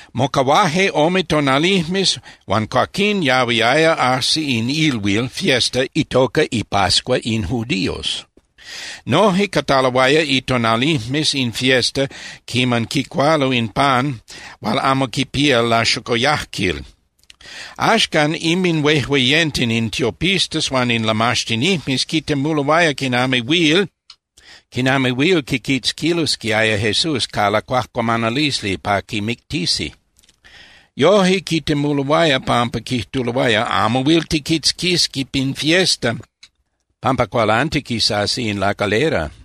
Mocahuaje ome tonalijmes huan cuaquín yahuiaya ajsi in ilhuil (fiesta) itoca ipascua in judíos. Noje cataloaya itonalijmes in fiesta quiman quicualo in pan hual amo quipía laxocoyajquil. Axcan inminhuejueyenten in tiopistas huan in lamaxtinijmes quitemuloaya quinami huil quiquitzquilosquiaya Jesús ca lacuajcuamanalisli pa quimictisi. Yoje quitemuloaya pampa quijtuloaya: —Amo huil tijquitzquisi pin fiesta pampa cualantiquisasi in lacalera.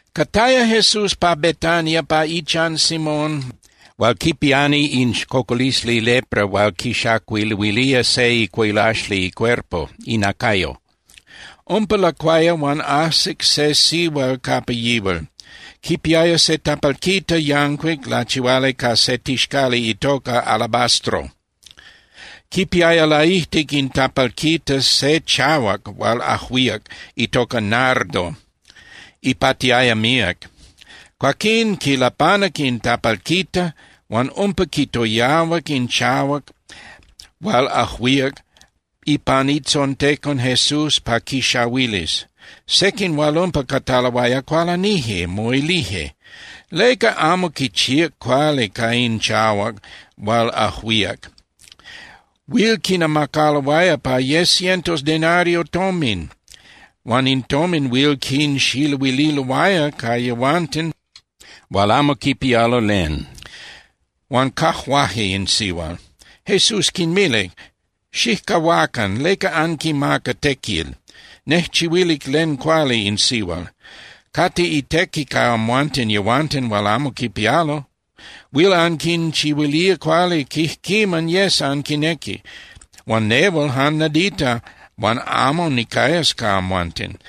Cataya Jesús pa Betania pa ichan Simón hual quipiani in cocolisli lepra hual quixacualuilía se icuilaxli icuerpo (inacayo). Umpa lacuaya huan ajsic se sihual capa yihual, quipiaya se tapalquita yancuic lachihuali ca se tixcali itoca alabastro. Quipiaya laijtic in tapalquita se chahuac hual ajuíac itoca nardo, ipatiaya míac. Cuaquín quilapanac in tapalquita, huan umpa quitoyahuac in chahuac hual ajuíac ipan itzontecon Jesús pa quixahuilis. Sequin hual umpa cataloaya cualanije, moilije: —¿Leca amo quichíac cuali ca in chahuac hual ajuíac? Huil quinamacaloaya pa ye cientos denario tomin huan in tomin huil quinxiluililoaya ca yehuanten hual amo quipialo len. Huan cajuaje in sihual. Jesús quinmilic: —Xijcahuacan, ¿leca anquimaca tequil? Nejchihuilic len cuali in sihual. Cate itequi ca amhuanten yehuanten hual amo quipialo. Huil anquinchihuilía cuali quijquiman yes anquinequis. Huan nehual jan nadita huan amo nicayas ca amhuanten.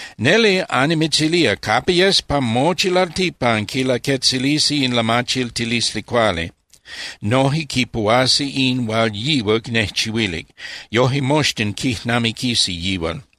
Neli annimitzilía, capa yes pa mochi lalticpan quilaquetzilisi in lamachiltilisli cuali, noje quipuhuasi in hual yihual nejchihuilic. Yoje moxtin quijnamiquisi yihual.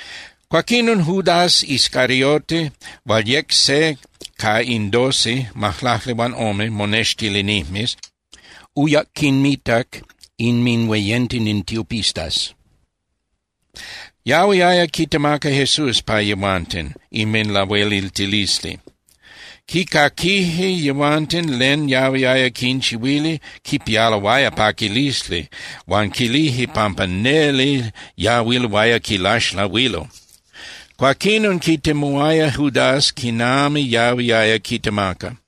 Cuaquinon Judas Iscariote hual yec se ca in doce (majlaclihuanome) monextilinijmes uyac quinmitac inminhueyenten in tiopistas. Yahuiaya quitemaca Jesús pa yehuanten inminlahueliltilisli. Quicaquije yehuanten len yahuiaya quinchihuili, quipialoaya paquilisli huan quilije pampa neli yahuiloaya quilaxlahuilo. Cuaquinon quitemuaya Judas quinami yahuiaya quitemaca.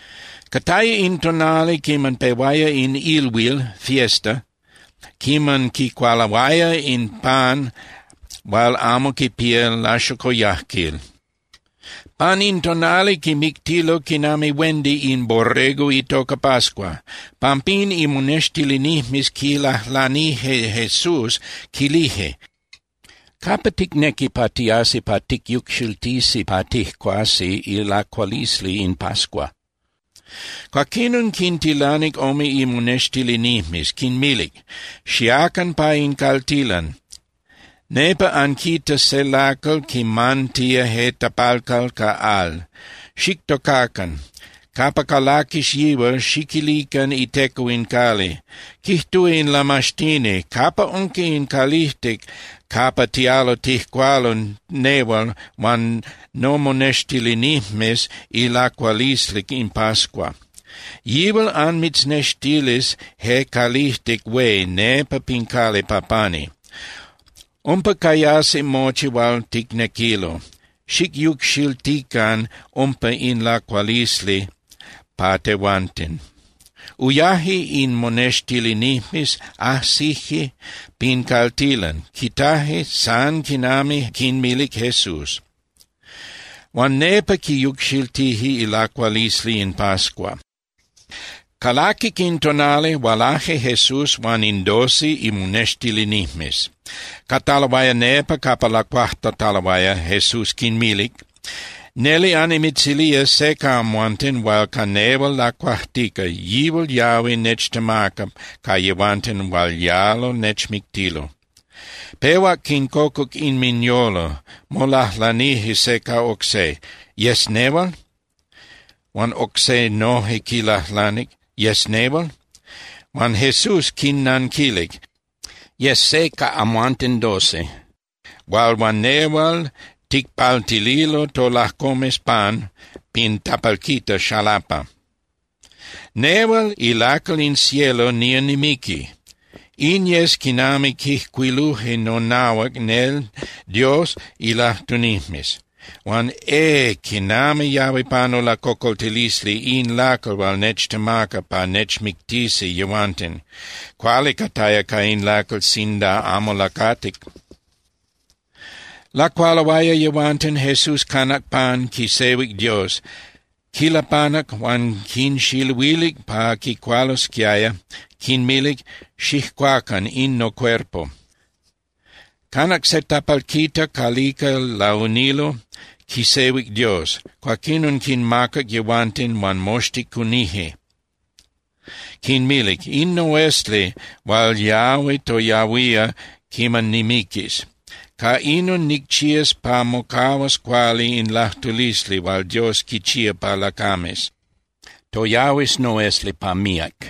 Cataya in tonali quiman pehuaya in ilhuil (fiesta) quiman quicualoaya in pan hual amo quipía laxocoyajquil. Pan in tonali quimictilo quinami huendi in borrego itoca pascua. Pampín imonextilinijmes quilajlanije Jesús, quilije: —¿Capa ticnequi pa tiasi pa ticyucxiltisi pa tijcuasi ilacualisli in pascua? Cuaquinon quintilanic ome imonextilinijmes, quinmilic: —Xiacan pa in caltilan, nepa anquitas se lacal quimantía je tapalcal ca al. Xictocacan. Capa calaquis yihual, xiquilican iteco in cali: “Quijtúa in Lamaxtini: ¿Capa unca in calijtic capa tialo tijcualo nehual huan nomonextilinijmes ilacualisli in pascua?” Yihual anmitznextilis je calijtic hué nepa pin cali pa pani. Umpa cayasi mochi hual ticnequilo. Xicyucxiltican umpa in lacualisli pa tehuanten. Uyaje in monextilinijmes, ajsije pin caltilan, quitaje san quinami quinmilic Jesús. Huan nepa quiyucxiltije ilacualisli in pascua. Calaquic in tonali, hualaje Jesús huan in doce imonextilinijmes. Cataloaya nepa capa lacuajtataloaya, Jesús quinmilic: —Neli annimitzilía, se ca amhuanten hual ca nehual lacuajtica, yihual yahui nechtemaca ca yehuanten hual yalo nechmictilo. Pehuac quincocuc inminyolo, molajlanije se ca oc se: —¿Yes nehual? Huan oc se noje quilajlanic: —¿Yes nehual? Huan Jesús quinnanquilic: —Yes se ca amhuanten doce hual huan nehual ticpaltililo tolajcomes pan pin tapalquita xalapa. Nehual ilacal in cielo nía nimiqui. In yes quinami quijcuiluje nonahuac nel Dios ilajtunijmes. Huan ¡eh, quinami yahui panu lacocoltilisli in lacal hual nechtemaca pa nechmictisi yehuanten! Cuali cataya ca in lacal sinda amo lacatic. Lacualoaya yehuanten, Jesús canac pan, quisehuic Dios, quilapanac huan quinxiluilic pa quicualosquiaya, quinmilic: —Xijcuacan, in nocuerpo. Canac se tapalquita calica launilo, quisehuic Dios. Cuaquinon quinmacac yehuanten huan moxtin cunije. Quinmilic: —In noesli hual yahui toyahuía quiman nimiquis. Ca inon nicchías pa mocahuas cuali in lajtulisli hual Dios quichía pa lacames. Toyahuis noesli pa míac.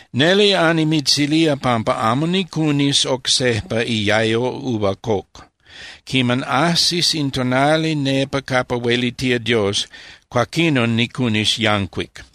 Neli annimitzilía pampa amo nicunis oc sejpa iayo uva coc. Quiman ajsis in tonali nepa capa huelitía Dios, cuaquinon nicunis yancuic.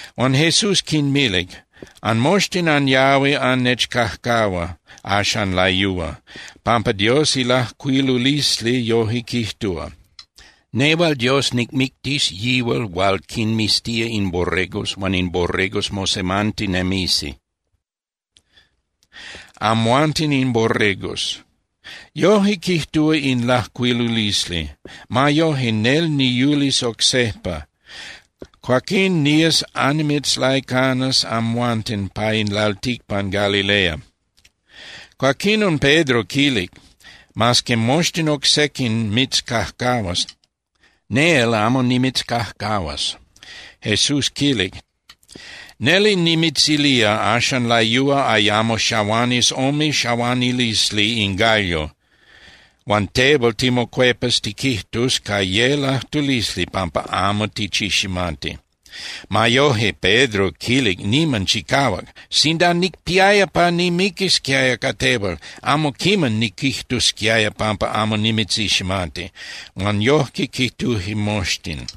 Huan Jesús quinmilic: —Anmoxtin anyahui annechcajcahua axan layúa, pampa Dios ilajcuilulisli yoje quijtúa: “Nehual Dios nicmictis yihual hual quinmiztía in borregos huan in borregos mosemantinemisi.” Amhuanten in borregos. Yoje quijtúa in lajcuilulisli. Ma yoje, nel niyulis oc sejpa. Cuaquín nías annimitzlaicanas amhuanten pa in lalticpan Galilea. Cuaquinon Pedro quilic: —Mas que moxtin oc sequin mitzcajcahuas, nel amo nimitzcajcahuas. Jesús quilic: —Neli nimitzilía, axan layúa ayamo xahuanis ome xahuanilisli in gallo, huan tehual timocuepas tiquijtus ca ye lajtulisli pampa amo tichiximati. Ma yoje, Pedro quilic niman chicahuac: —Sinda nicpiaya pa nimiquisquiaya ca tehual, amo quiman niquijtusquiaya pampa amo nimitziximati. Huan yojque quijtuje moxtin.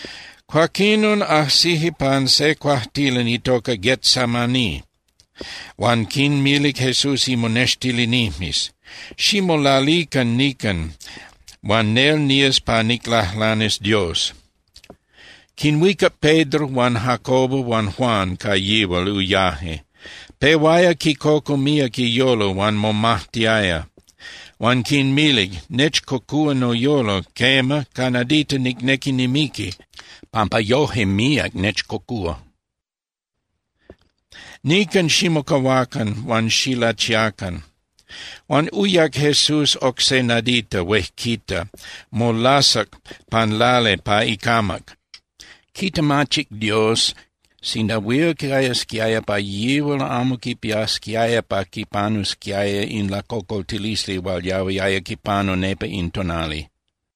Cuaquinon ajsije pan se cuajtilan itoca Getsemaní huan quinmilic Jesús imonextilinijmes: —Ximolalican nican huan nel nías pa niclajlanis Dios. Quinhuicac Pedro huan Jacobo huan Juan, ca yihual uyaje. Pehuaya quicocu míac iyolo huan momajtiaya. Huan quinmilic: —Nechcocúa noyolo, quema, ca nadita nicnequi nimiqui pampa yoje míac nechcocúa. Nican ximocahuacan huan xilachiacan. Huan uyac Jesús oc se nadita huejquita, molasac pan lali pa icamac. Quitemachic Dios sinda huil cayasquiaya pa yihual amo quipiasquiaya pa quipanusquiaya in lacocoltilisli hual yahuiaya quipanu nepa in tonali.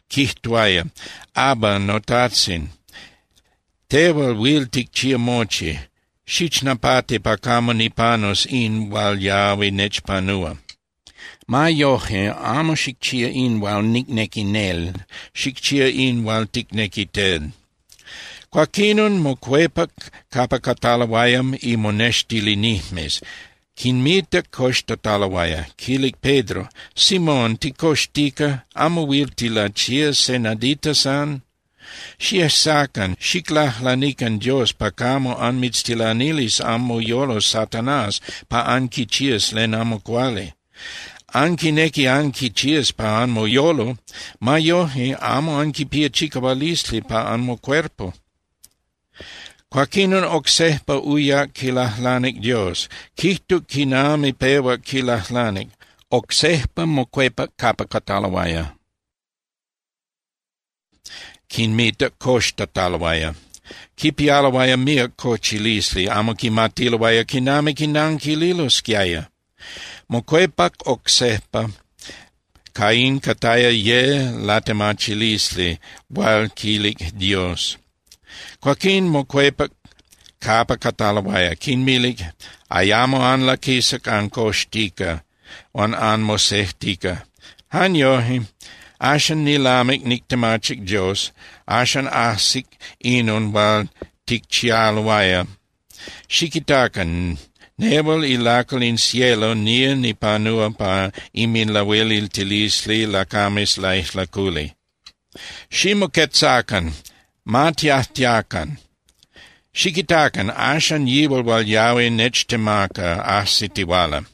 Quijtuaya: —Abba, noTajtzin, tehual huil ticchía mochi, xichnapati pa camo nipanus in hual yahui nechpanúa. Ma yoje, amo xicchía in hual nicnequi nel, xicchía in hual ticnequi tel. Cuaquinon mocuepac capa cataloaya imonextilinijmes, quinmitac coxtataloaya. Quilic Pedro: —Simón, ¿ticoxtica? ¿Amo huil tilachía se nadita san? Xiejsacan, xiclajlanican Dios pa camo anmitztilanilis anmoyolo Satanás pa anquichías len amo cuali. Anquinequi anquichías pa anmoyolo. Ma yoje, amo anquipía chicahualisli pa anmocuerpo. Cuaquinon oc sejpa uyac quilajlanic Dios, quijtuc quinami pehuac quilajlanic. Oc sejpa mocuepac capa cataloaya, quinmitac coxtataloaya. Quipialoaya míac cochilisli, amo quimatiloaya quinami quinanquililosquiaya. Mocuepac oc sejpa, ca in cataya ye latemachilisli hual quilic Dios. Cuaquín mocuepac capa cataloaya, quinmilic: —Ayamo anlaquisa ancoxtica huan anmosejtica. Jan yoje. Axan nilamic nictemachic Dios, axan ajsic inon hual ticchialoaya. Xiquitacan. Nehual ilacal in cielo nía nipanúa pa inminlahueliltilisli lacames laijlaculi. Ximoquetzacan, ma tiajtiacan. Xiquitacan, axan yihual hual yahui nechtemaca ajsitihuala.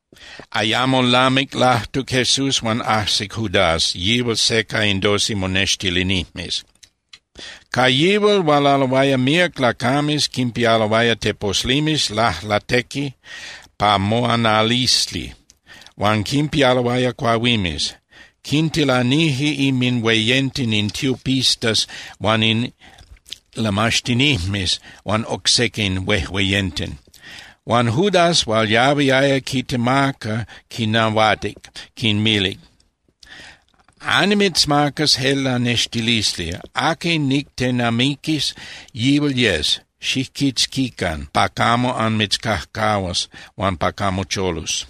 Ayamo lamic lajtuc Jesús huan ajsic Judas, yihual se ca in doce monextilinijmes. Ca yihual hualaloaya míac lacames quinpialoaya teposlimes lajlatequi pa moanalisli, huan quinpialoaya cuahuimes. Quintilanije inminhueyenten in tiopistas huan in lamaxtinijmes huan oc sequin huejueyenten. Huan Judas hual yahuiaya quitemaca quinnahuatic, quinmilic: —Annimitzmacas je lanextilisli: Aqui nictenamiquis, yihual yes, xijquitzquican pa camo anmitzcajcahuas huan pa camo cholus.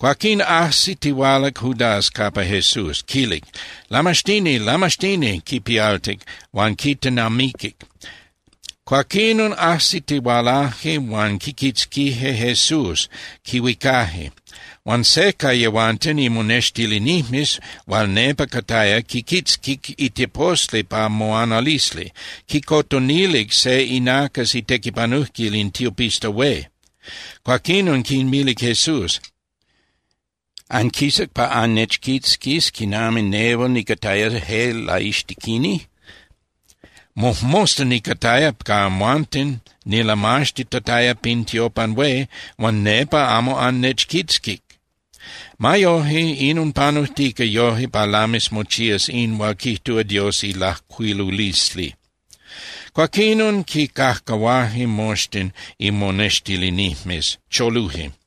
Cuaquín ajsitihualac Judas capa Jesús, quilic: —Lamaxtini, Lamaxtini —quipialtic, huan quitenamiquic. Cuaquinon ajsitihualaje huan quiquitzquije Jesús, quihuicaje. Huan se ca yehuanten imonextilinijmes hual nepa cataya quiquitzquic iteposli pa moanalisli, quicotonilic se inacas itequipanujquil in tiopista hué. Cuaquinon quinmilic Jesús: —¿Anquisac pa annechquitzquis quinami nehual nicataya je laixtequini? Mojmosta nicataya ca amhuanten nilamaxtitataya pin tiopan hué huan nepa amo annechquitzquic. Ma yoje, inon panujtica yoje pa lamis mochías in hual quijtúa Dios ilajcuilulisli. Cuaquinon quicajcahuaje moxtin imonextilinijmes, choluje.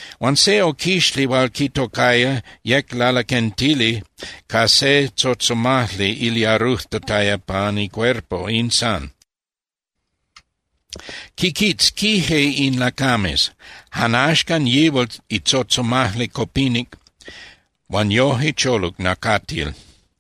Huan se oquixli hual quitocaya, yec lalaquentili ca se tzotzomajli iliarujtataya pan icuerpo, in san. Quiquitzquije in lacames. Jan axcan yihual itzotzomajli copinic huan yoje choluc nacatil.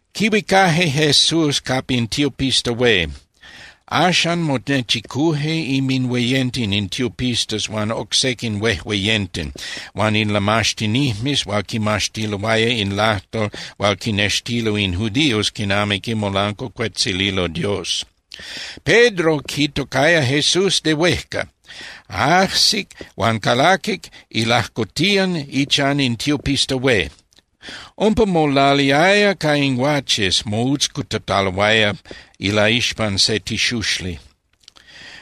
Quihuicaje Jesús capa in tiopista hué. Axan monechicuje inminhueyenten in tiopistas huan oc sequin huejueyenten huan in lamaxtinijmes hual quinmaxtiloaya in lajtol hual quinnextilo in judíos quinami quimolancuacuetzililo Dios. Pedro quitocaya Jesús de huejca, ajsic huan calaquic ilajcotiyan ichan in tiopista hué. Umpa molaliaya ca in guaches moutzcutataloaya ilaixpan se tixuxli.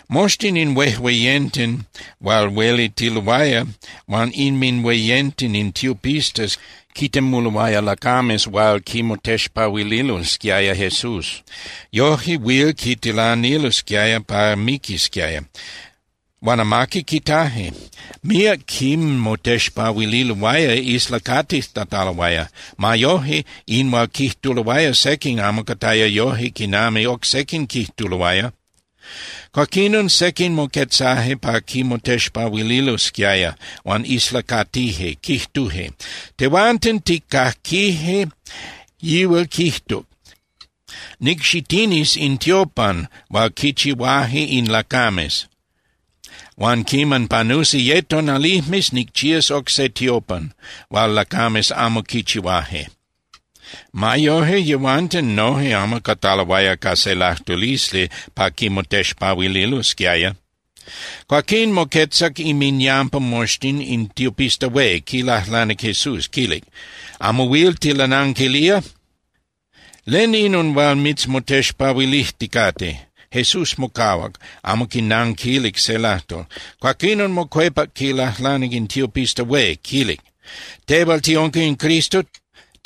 Moxtin in huejueyenten hual huelitiloaya huan inminhueyenten in tiopistas quitemuloaya lacames hual quimotexpahuililosquiaya Jesús. Yojque huil quitilanilosquiaya pa miquisquiaya. Huan amaqui quitaje. Míac quimotexpahuililoaya islacatijtataloaya. Ma yoje, in hual quijtuloaya sequin amo cataya yoje quinami oc sequin quijtuloaya. Cuaquinon sequin moquetzaje pa quimotexpahuililosquiaya, huan islacatije, quijtuje: —Tehuanten tijcaquije yihual quijtuc: “Nicxitinis in tiopan hual quichihuaje in lacames, huan quiman panusi ye tonalijmes nicchías oc se tiopan hual lacames amo quichihuaje.” Ma yoje, yehuanten noje amo cataloaya ca se lajtulisli pa quimotexpahuililosquiaya. Cuaquín moquetzac inminyampa moxtin in tiopista hué, quilajlanic Jesús, quilic: —¿Amo huil tilananquilía? ¿Len inon hual mitzmotexpahuilijticate? Jesús mocahuac, amo quinanquilic se lajtol. Cuaquinon mocuepac quilajlanic in tiopista hué, quilic: —¿Tehual tiunca in Cristo?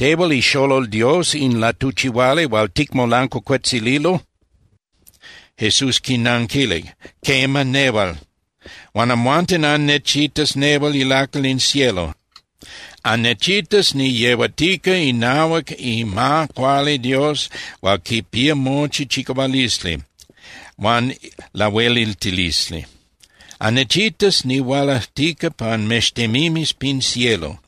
¿Tehual ixolol Dios in latuchihuali hual ticmolancuacuetzililo? Jesús quinanquilic: —Quema, nehual. Huan amhuanten annechitas nehual ilacal in cielo. Annechitas niyehuatica inahuac ima cuali Dios hual quipía mochi chicahualisli huan lahueliltilisli. Annechitas nihualajtica pan mextemimes pin cielo.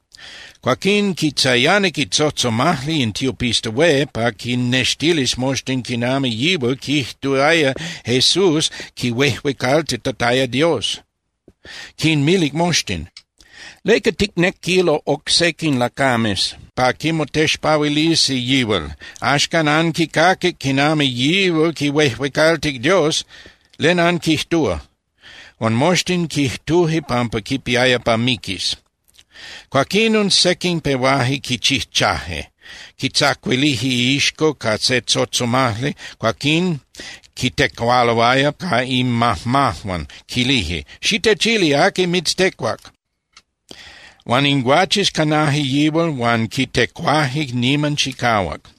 Cuaquín quitzayanic itzotzomajli in tiopista hué pa quinnextilis moxtin quinami yihual quijtuaya Jesús quihuejuecaltitataya Dios. Quinmilic moxtin: —¿Leca ticnequilo oc sequin lacames pa quimotexpahuilisi yihual? Axcan anquicaquic quinami yihual quihuejuecaltic Dios. ¿Len anquijtúa? Huan moxtin quijtuje pampa quipiaya pa miquis. Cuaquinon sequin pehuaje quichijchaje. Quitzacuilije iixco ca se tzotzomajli, cuaquín quitecualoaya ca inmajmajuan, quilije: —¡Xitechili aqui mitztecuac! Huan in guaches canaje yihual huan quitecuaje niman chicahuac.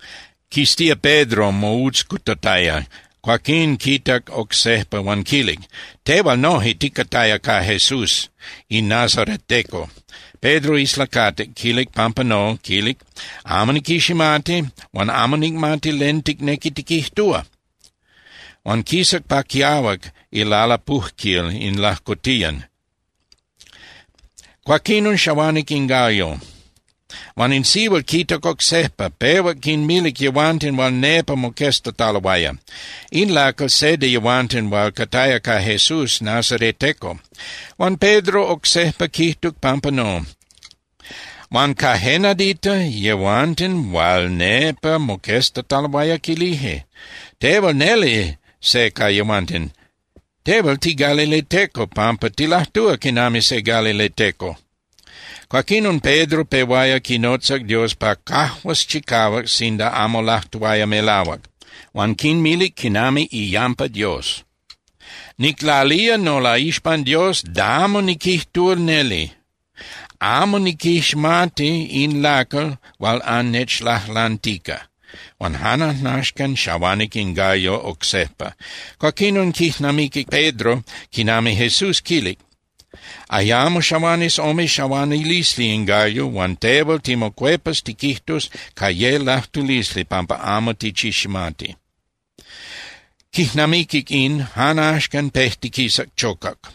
Quiztíac Pedro moutzcutataya, cuaquín quitac oc sejpa huan quilic: —Tehual noje ticataya ca Jesús in nazareteco. Pedro islacatic, quilic pampa no, quilic: —Amo niquiximati huan amo nicmati len ticnequi tiquijtúa. Huan quisac pa quiahuac ilalapujquil in lajcotiyan. Cuaquinon xahuanic in gallo. Huan in sihual quitac oc sejpa, pehuac quinmilic yehuanten hual nepa moqueztataloaya: —In lacal se de yehuanten hual cataya ca Jesús nazareteco. Huan Pedro oc sejpa quijtuc pampa no. Huan ca je nadita, yehuanten hual nepa moqueztataloaya quilije: —Tehual neli se ca yehuanten. Tehual tigalileteco pampa tilajtúa quinami se galileteco. Cuaquinon Pedro pehuaya quinotza Dios pa cajuas chicahuac sinda amo lajtuaya melahuac, huan quinmilic quinami iyampa Dios: —Niclalía nolaixpan Dios damo niquijtúa neli, amo niquiximati in lacal hual annechlajlantica. Huan jan ajnaxcan xahuanic in gallo oc sejpa. Cuaquinon quijnamiquic Pedro quinami Jesús quilic: “Ayamo xahuanis ome xahuanilisli in gallo, huan tehual timocuepas tiquijtus ca ye lajtulisli pampa amo tichiximati.” Quijnamiquic in, jan axcan pejtiquisac chocac.